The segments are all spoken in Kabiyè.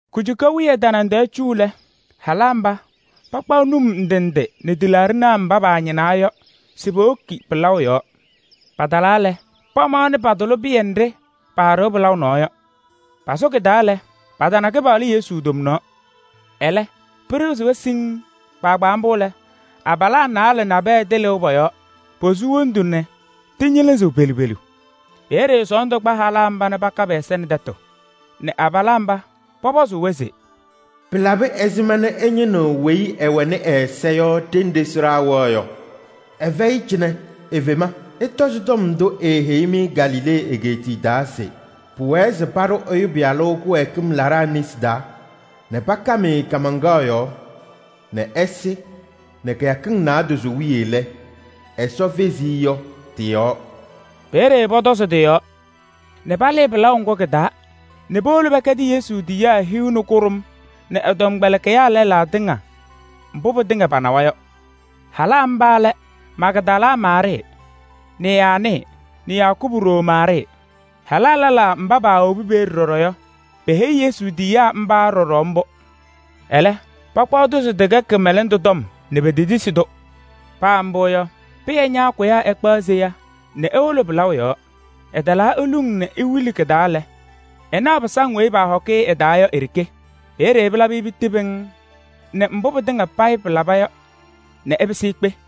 Kujuka wiye tanaŋ tɛɛ cu lɛ, halaa mba pakpaɣ num ndɩ ndɩ nɛ tɩlaaɖɩnaa mba paañɩnaa yɔ se powoki pɩlaʋ yɔɔ. Patalaa lɛ, pamaɣnɩ patʋlɩ pɩyɛ nɖɩ paaɖɩɣ pɩlaʋ nɔɔ yɔ. Pasʋ kɩ-taa lɛ, patana Kɩpaɣlʋ Yesu tomnaɣ. Ɛlɛ, pɩɖɩɣzɩ-wɛ siŋŋ. Kpaagbaa mbʋ lɛ, abalaa naalɛ nabɛyɛ tɩlɩʋ pɔ-yɔɔ. Posu wondu, nɛ tɩñɩlɩzɩɣ pelu pelu. Peeye sɔɔndʋ kpa halaa mba nɛ paka pɛ-ɛza nɛ tɛtʋ nɛ abalaa mba pɔpɔzʋʋ-wɛ se: “Pɩlabɩ ɛzɩma nɛ ɩñɩnɩɣ weyi ɛwɛnɩ ɛ-ɛza yɔ ɖenɖe sɩɖaa wɛɣ yɔ? Ɛfɛyɩ cɩnɛ, efema. Ɩtɔzɩ tɔm ndʋ eeheyi-mɩ Galilee egeetiye taa se: pʋwɛɛ se paɖʋ Ɛyʋ Pɩyalʋ kɩwɛɛkɩm laɖaa nesi taa nɛ pakam-ɩ kaamaŋkaɣ yɔɔ nɛ ɛsɩ nɛ kɩyakɩŋ naadozo wiye lɛ, Ɛsɔ fezi-i yɔ tɩ-yɔɔ.” Peeye pɔtɔzɩ tɩ-yɔɔ nɛ palɩɩ pɩlaʋ ŋgʋ kɩ-taa nɛ powolo pɛkɛdɩ Yesu tiyiyaa hiu nɛ kʋɖʋm nɛ ɛ-tɔmkpɛlɩkɩyaa lɛlaa tɩŋa mbʋ pɩtɩŋa panawa yɔ. Halaa mba lɛ: Magdala Maarɩɩ nɛ Yaanɩ nɛ Yakubu ɖoo Maarɩɩ. Halaa lɛlaa mba paawobi peeye ɖɔɖɔ yɔ, peheyi Yesu tiyiyaa mba ɖɔɖɔ mbʋ. Ɛlɛ, pakpaɣ-tʋ se tɩkɛ kɩmɛlɛndʋ tɔm nɛ petetisi-tʋ. [ Paa mbʋ yɔ, Pɩyɛ ñaakʋyaa ɛkpaɣ seya nɛ ewolo pɩlaʋ yɔɔ. Ɛtalaa eluŋ nɛ ewili kɩ-taa lɛ, ɛnaɣ pɩsaŋ weyi paahɔkɩ-ɩ ɩ-taa yɔ i-ɖeke. Peeye pɩlabɩ-ɩ piti pɩŋŋ nɛ mbʋ pɩtɩŋa payɩ pɩlaba yɔ nɛ ɛpɩsɩ ekpe.]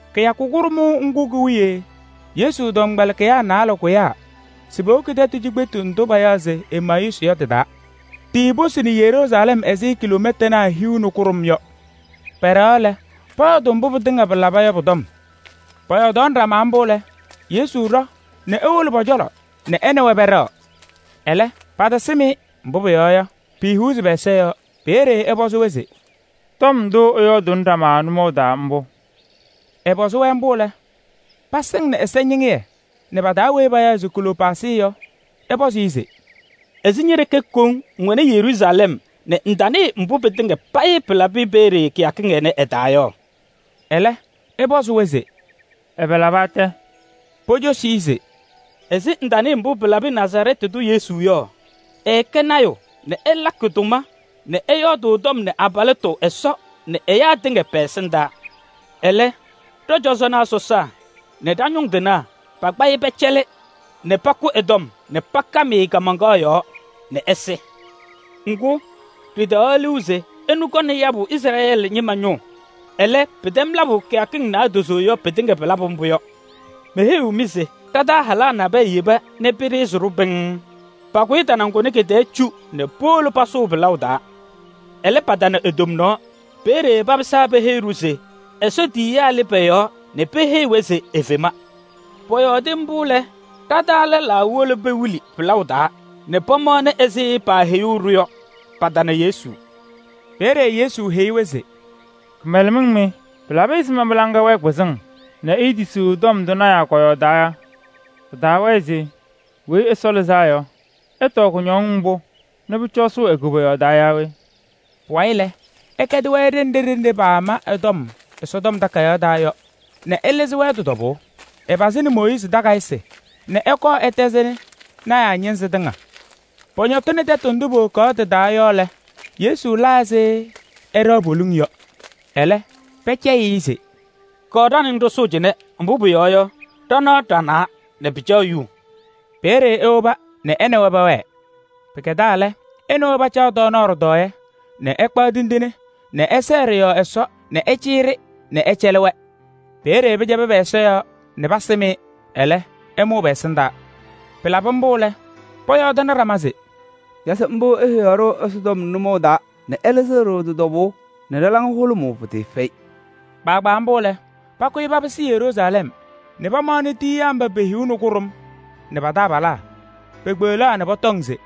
Kɩyakʋ kʋɖʋmʋʋ ŋgʋ ki-wiye Yesu tɔmkpɛlɩkɩyaa naalɛ kʋyaa se powoki tɛtʋ cikpetu ndʋ payaɣ se Emayuusɩ yɔ tɩ-taa. Tiiposini Yeruusalɛm ɛzɩ kiloomɛtanaa hiu nɛ kʋɖʋm yɔ. Pɛɖɛɣaɣ lɛ, pɔyɔɔdʋʋ mbʋ pɩtɩŋa pɩlaba yɔ pʋ-tɔm. Pɔyɔɔdaɣnɩ ɖama mbʋ lɛ, Yesu ɖɔ nɛ ewolo pɔ-cɔlɔ nɛ ɛ nɛ wɛ pɛɖɛɣ. Ɛlɛ, patasɩm-ɩ, mbʋ pʋyɔɔ yɔ, piihuuzi pɛ-ɛza yɔɔ. Peeye ɛpɔzɩ-wɛ se: “Tɔm ndʋ ɩyɔɔdʋʋnɩ ɖama nʋmɔʋ taa mbʋ?” Ɛpɔzɩ-wɛ mbʋ lɛ, pasɩŋnɩ ɛsɛñɩŋɩyɛ nɛ pa-taa weyi payaɣ se Kleyoopaasɩ yɔ, ɛpɔzɩ-ɩ se: “Ɛzɩ ñe-ɖeke koŋ ŋwɛnɩ Yeruusalɛm nɛ ŋtanɩɩ mbʋ pɩtɩŋa payɩ pɩlabɩ peeye kɩyakɩŋ ɩnɛ ɩ-taa yɔ?” Ɛlɛ ɛpɔzɩ-wɛ se: “Ɛbɛ laba tɛ?” Pocosi-i se: “Ɛzɩ ŋtanɩɩ mbʋ pɩlabɩ Nazarɛɛtɩ tʋ Yesu yɔ? Ɛɛkɛ lɔɔyaɣ tʋ nɛ ɛlakɩ tʋma nɛ ɛyɔɔdʋʋ tɔm nɛ abalɩtʋ Ɛsɔ nɛ ɛyaa tɩŋa pɛ-ɛsɩndaa. Ɛlɛ, ɖɔ-cɔjɔnaa sɔsaa nɛ ɖa-ñʋŋ tɩnaa pakpa-ɩ pɛcɛlɩ nɛ pakʋ ɛ-tɔm nɛ pakam-ɩ kaamaŋkaɣ yɔɔ nɛ ɛsɩ. Ŋgʋ, ɖɩtaɣaɣ liu se ɛnʋ kɔŋnɩ yabʋ Izrɛɛlɩ ñɩma ñʋʋ. Ɛlɛ, pɩtɛm labʋ kɩyakɩŋ naadozo yɔ, pɩtɩŋa pɩlabʋ mbʋ yɔ. Meheyiɣ-mɩ se ɖa-taa halaa nabɛyɛ yeba nɛ pɩɖɩɣzɩ-ɖʋ pɩŋŋ. Pakʋyɩ tanaŋ kʋnɛ kɩ-tɛɛ cu nɛ powolo pasʋʋ pɩlaʋ taa ɛlɛ, patana e-tomnaɣ. Peeye papɩsaa peheyi-ɖʋ se Ɛsɔ tiyiyaa lɩ pɔ-yɔɔ nɛ peheyi-wɛ se efema. Pɔyɔɔdɩ mbʋ lɛ, ɖa-taa lɛlaa wolo pewili pɩlaʋ taa nɛ pamaɣnɩ ɛzɩ paaheyuu-ɖʋ yɔ. Patana Yesu.” Peeye Yesu tɔm-wɛ se: “Kɩmɛlɛmɩŋ mɩ! Pɩlabɩ ɛzɩma mɩ-laŋa wɛɛ kpɩzɩŋ nɛ iitisiɣ tɔm ndʋ lɔɔyɩsɩ tɩnaa kɔyɔɔdaa yɔ? Pɩtaawɛɛ se Weyi Ɛsɔ Lɩzaa Yɔ, ɛtɔɔ kʋñɔŋ mbʋ nɛ pʋcɔ ɛsʋʋ e-koboyaɣ taa yaa we?” Pʋwayɩ lɛ, ɛkɛdɩ-wɛ ɖenɖe ɖenɖe paama ɛ-tɔm Ɛsɔtɔm Takayaɣ taa yɔ nɛ ɛlɩzɩ-wɛ tɩ-tɔbʋʋ. Ɛpazɩnɩ Mooyiizi takayɩsɩ nɛ ɛkɔɔ ɛtɛzɩnɩ lɔɔyɩsɩ tɩnaa ñɩnzɩ tɩŋa. Pɔñɔtɩnɩ tɛtʋ ndʋ powokaɣ ɖɩ-taa yɔ lɛ, Yesu la ɛzɩ ɛɖɛɣ poliŋ yɔ. Ɛlɛ, pɛcɛyɩ-ɩ se: “Kɔɔ ɖa nɛ ŋ ɖɩsʋʋ cɩnɛ. Mbʋ pʋyɔɔ yɔ, ɖanaɣ ɖanaa nɛ pɩcaɣ yuu.” Peeye ewoba nɛ ɛ nɛ wɛ pɛwɛɛ. Pɩkɛdaa lɛ, ɛ nɛ wɛ pacaɣ tɔɔnaɣ ɖɩtɔɔyɛ nɛ ɛkpaɣ tindine nɛ ɛsɛɛ ɖɩ-yɔɔ Ɛsɔ nɛ ɛcɩyɩ-ɖɩ nɛ ɛcɛlɩ-wɛ. Peeye pɩcɛbɩ pɛ-ɛza yɔɔ nɛ pasɩm-ɩ. Ɛlɛ, ɛmʋʋ pɛ-ɛsɩndaa. Pɩlabɩ mbʋ lɛ, pɔyɔɔdɩnɩ ɖama se: “Naze mbʋ eheyaɣ-ɖʋ Ɛsɔtɔm nʋmɔʋ taa nɛ ɛlɩzɩɣ-ɖʋ tɩ-tɔbʋʋ nɛ ɖa-laŋa hʋlʋmʋʋ pɩtɩɩfɛyɩ!” Kpaagbaa mbʋ lɛ, pakʋyɩ papɩsɩ Yeruusalɛm nɛ pamaɣnɩ tiyiyaa mba pe-hiu nɛ kʋɖʋm nɛ pa-taabalaa. Paakpeɣlaa nɛ pɔtɔŋ se: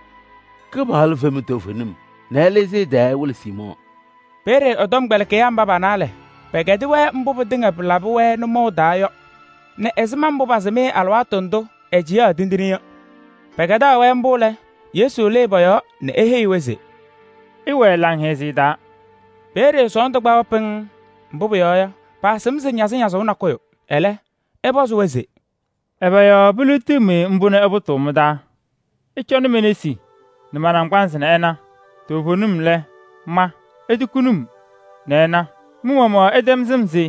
“Kɩpaɣlʋ fema toovenim nɛ ɛlɩzɩ ɛ-tɩ ɛwɩlɩ Siimɔɔ.” Peeye ɛ-tɔmkpɛlɩkɩyaa mba pa-naalɛ pɛkɛdɩ-wɛ mbʋ pɩtɩŋa pɩlabɩ-wɛ nʋmɔʋ taa yɔ, nɛ ɛzɩma mbʋ paasɩm-ɩ alɩwaatʋ ndʋ ɛcɩyaɣ tindine yɔ. Pɛkɛdaɣ-wɛ mbʋ lɛ, Yesu lɩɩ pɔ-yɔɔ [nɛ eheyi-wɛ se: “Ɩwɛɛ laŋhɛzɩyɛ taa.”] Peeye sɔɔndʋ kpa-wɛ pɩŋŋ, mbʋ pʋyɔɔ yɔ, paasɩm se ñazɩñazʋʋ nakʋyʋ. Ɛlɛ, ɛ-pɔzɩ-wɛ se: “Ɛbɛ yɔɔ piliɣtiɣ-mɩ mbʋ nɛ ɩpʋtʋʋ mɩ-taa? Ɩcɔnɩ me-nesi nɛ ma-naŋgbanzɩ nɛ ɩna. Toovenim lɛ, ma! Itukuni-m nɛ ɩna, mɩ-maɣmaɣ ɩtɛm sɩm se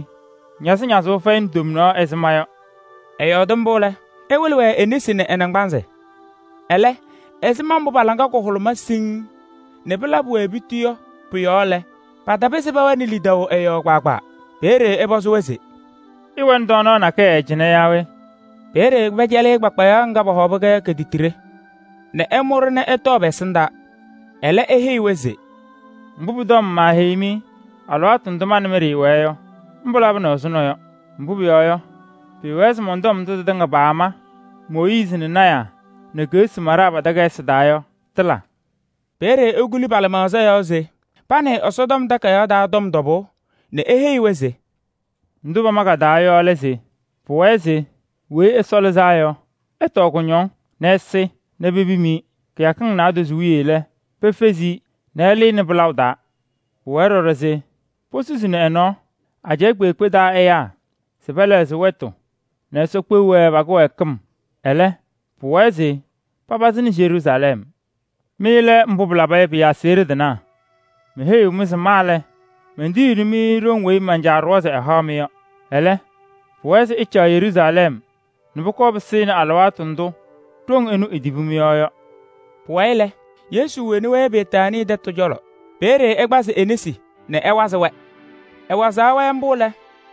ñazɩñazʋʋ fɛyɩnɩ tomnaɣ ɛzɩ ma yɔ.” [ Ɛyɔɔdɩ mbʋ lɛ, ɛwɩlɩ-wɛ e-nesi nɛ ɛ-naŋgbanzɩ.] Ɛlɛ ɛzɩma mbʋ pa-laŋa kahʋlʋmaa siŋŋ nɛ pɩlabɩ-wɛ piti lɛ, patapɩzɩ pɛwɛnɩ lidaʋ ɛ-yɔɔ ɖɔɖɔ. Peeye ɛpɔzɩ-wɛ se: “Ɩwɛnɩ tɔɔnaɣ nakɛyɛ cɩnɛ yaa we?” Peeye pɛcɛlɩ-ɩ kpakpayaɣ kɩwɩsaɣ titiɖe nɛ ɛmʋ-ɖɩ ɛtɔɔ pɛ-ɛsɩndaa. Ɛlɛ eheyi-wɛ se: “Mbʋ pʋ-tɔm maaheyi-mɩ alɩwaatʋ ndʋ ma nɛ mɩ ɖɩɩwɛɛ yɔ, mbʋ labɩnɩ ɛzʋnɔ yɔ. Mbʋ pʋyɔɔ yɔ, pɩɩwɛɛ se mɔn-tɔm ndʋ tɩtɩŋa paama Mooyiizi nɛ lɔɔyɩsɩ tɩnaa nɛ keɣsi maɖaa pa-takayɩsɩ taa yɔ, tɩla.” Peeye ekuli pa-lɩmaɣza yɔɔ se panɩɩ Ɛsɔtɔm Takayaɣ taa tɔm tɔbʋʋ nɛ eheyi-wɛ se: “Ndʋ pama ka-taa yɔ lɛ se pʋwɛɛ se Weyi Ɛsɔ Lɩzaa Yɔ, ɛtɔɔ kʋñɔŋ nɛ ɛsɩ nɛ pepim-i. Kɩyakɩŋ naadozo wiye lɛ, pefezi-i nɛ ɛlɩnɩ pɩlaʋ taa. Pʋwɛɛ ɖɔɖɔ se posusini ɛ-nɔɔ ajɛɛ kpeekpe taa ɛyaa se pɛlɛɣzɩ wɛtʋ nɛ Ɛsɔ kpeɣ-wɛ pa-kɩwɛɛkɩm. Ɛlɛ, pʋwɛɛ se papazɩnɩ Yeruusalɛm. Mɩ lɛ mbʋ pɩlaba yɔ pɩ-aseɣɖe tɩnaa. Meheyiɣ-mɩ se ma lɛ, mentiyiɣni-mɩ ɖoŋ weyi man-Caa ɖʋwa se ɛhaɣ-mɩ yɔ. Ɛlɛ, pʋwɛɛ se ɩcaɣ Yeruusalɛm nɛ pʋkɔɔ pɩsɩnɩ alɩwaatʋ ndʋ ɖoŋ ɛnʋ etibi mɩ-yɔɔ yɔ.” Pʋwayɩ lɛ, Yesu woni-wɛ Betaanii tɛtʋ cɔlɔ. Peeye ɛkpazɩ e-nesi nɛ ɛwazɩɣ pɔ-yɔɔ. Ɛwazaɣ pɔ-yɔɔ mbʋ lɛ,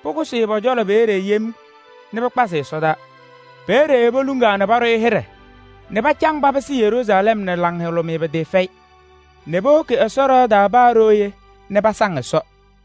pʋkʋsɩ-ɩ pɔ-cɔlɔ peeye yem nɛ pɩkpazɩ-ɩ ɛsɔdaa. Peeye poluŋaa nɛ paɖʋ-ɩ hɩɖɛ nɛ pacaŋ papɩsɩ Yeruusalɛm nɛ laŋhʋlʋmɩyɛ pɩtɩɩfɛyɩ nɛ powoki Ɛsɔ ɖɩɣa taa paa ɖooye nɛ pasaŋ Ɛsɔ.